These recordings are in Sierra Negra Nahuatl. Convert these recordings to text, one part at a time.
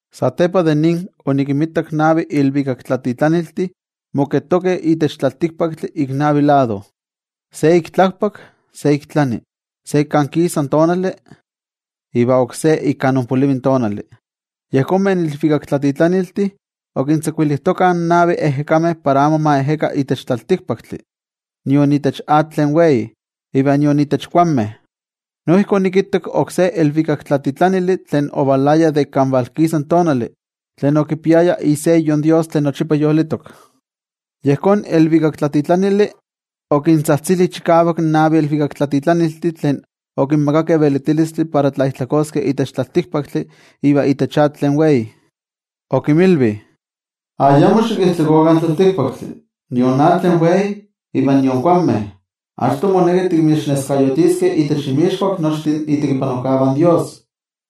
Satepa de nin, onikinmitak navi ilvikaktlatitlaniltih moketokeh itech tlaltikpaktli ik navi lado: se ik tlakpak, se ik tlani, se ik kan kisa tonali iva oksé ik kan onpolivi in tonali. Yejonmeh ilvikaktlatitlaniltih okintzakuilijtokah in navi ejekameh para amo ma ejeka itech tlaltikpaktli, nion itech atl tlen wei, iva nion itech kuanmeh. Noijki onikittak oksé ilvikaktlatitlanili tlen ovalaya de ik kan valkisa tonali, tlen okipiaya iseyo in toYejwatzi tlen yolitok. Yejón ilvikaktlatitlanili okintzajtzili chikavak in navi ilvikaktlatitlaniltih tlen okinmakakeh velitilistli para tlaijtlakoskeh itech tlaltikpaktli iva itech atl tlen wei. Okinmilvi: —Ayamo xikijtlakokah in tlaltikpaktli, nion atl tlen wei iva nion kuanmeh, achto moneki tikinneskayotiskeh itech inmixkuak nochtin itekipanojkavah in Dios.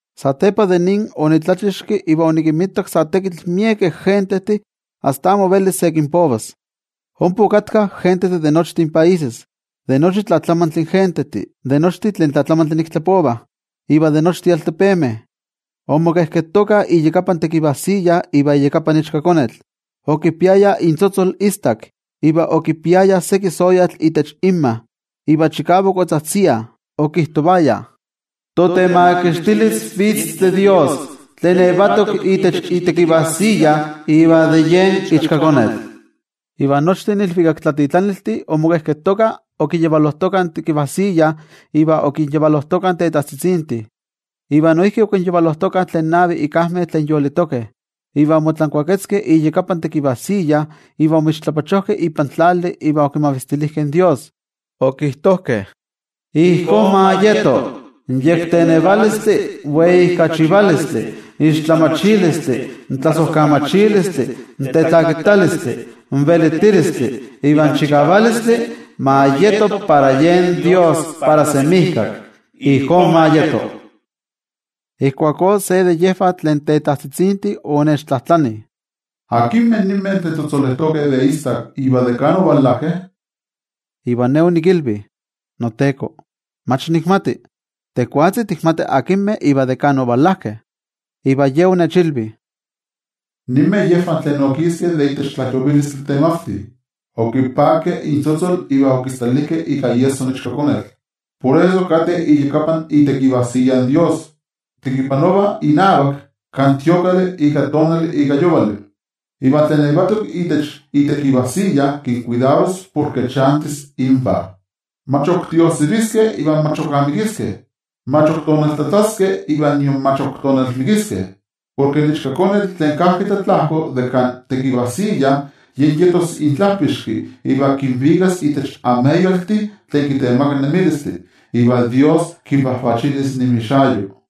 Satepa de nin, onitlachixki iva onikinmitak sa tekitl miekeh gentejtih asta amo velis se kinpovas. Ompa okatkah gentejtih de nochtin países, de nochi tlatlamantli gentejtih, de nochtin tlen tlatlamantli nik tlapovah iva de nochtin altepemeh. Omoketokah iyakapan tekivajsiya iva iyakapan Ichkakonetl. Okipiayah intzotzol istak iva okipiayah seki soyatl itech inmah. Iva chikavak otzajtziah, okijtovayah: Totemakixtilis vitz de Dios, tlen yetok itech itekivajsiya, iva de yen Ichkakonetl. Iva nochtin ilvikaktlatitlaniltih omoketokah okiyavalojtokah in tekivajsiya iva okinyavalojtokah in tetajtzitzintih, iva noijki okinyavalojtokah tlen navih ikajmeh tlen yolitokeh. Iva omotlankuaketzkeh iyakapan tekivajsiya iva omixtlapachojkeh ipan tlali iva okimavistilijkeh in toYejwatzi. Okijtojkeh: ¡Ijkó ma yeto! In yektenevalistli, in weijkachivalistli, in tlamatilistli, in tlasojkamachilistli, in tetlakitalistli, in velitilistli iva in chikavalistli, ma yeto para yen Dios para semijkak. Ijkó ma yeto. Ijkuakó se de yejvah tlen tetajtzitzintih onechtlajtlani: —¿Akinmeh ninmeh tlen tzotzolejtokeh de istak, iva de kan ovalajkeh? Iva ne onikilvi: —NoTeko, mach nikmati. Tejwatzi tikmati akinmeh iva de kan ovalajkeh. Iva Ye onechilvi: —Ninmeh yejvah tlen okiskeh de itech tlajyovilistli temavti. Okipakeh intzotzol iva okistalijkeh ika iesso in Ichkakonetl. Por eso kateh iyakapan itekivajsiya in Dios, tekipanovah inavak kan itemplo ika tonali ika yovali. Iva tlen yetok itech itekivajsiya kinkuidaros porke chantis invah. Mach ok tiojsiviskeh iva mach ok amikiskeh, mach ok tonaltlatlaskeh iva nion mach ok tonalmikiskeh. Porke in Ichkakonetl tlen kajki tlatlajko de kan tekivajsiya, yen yetos intlajpixki iva kinvikas itech ameyaltih tlen kitemakah nemilistli. Iva Dios kinvajvachilis inmixayo.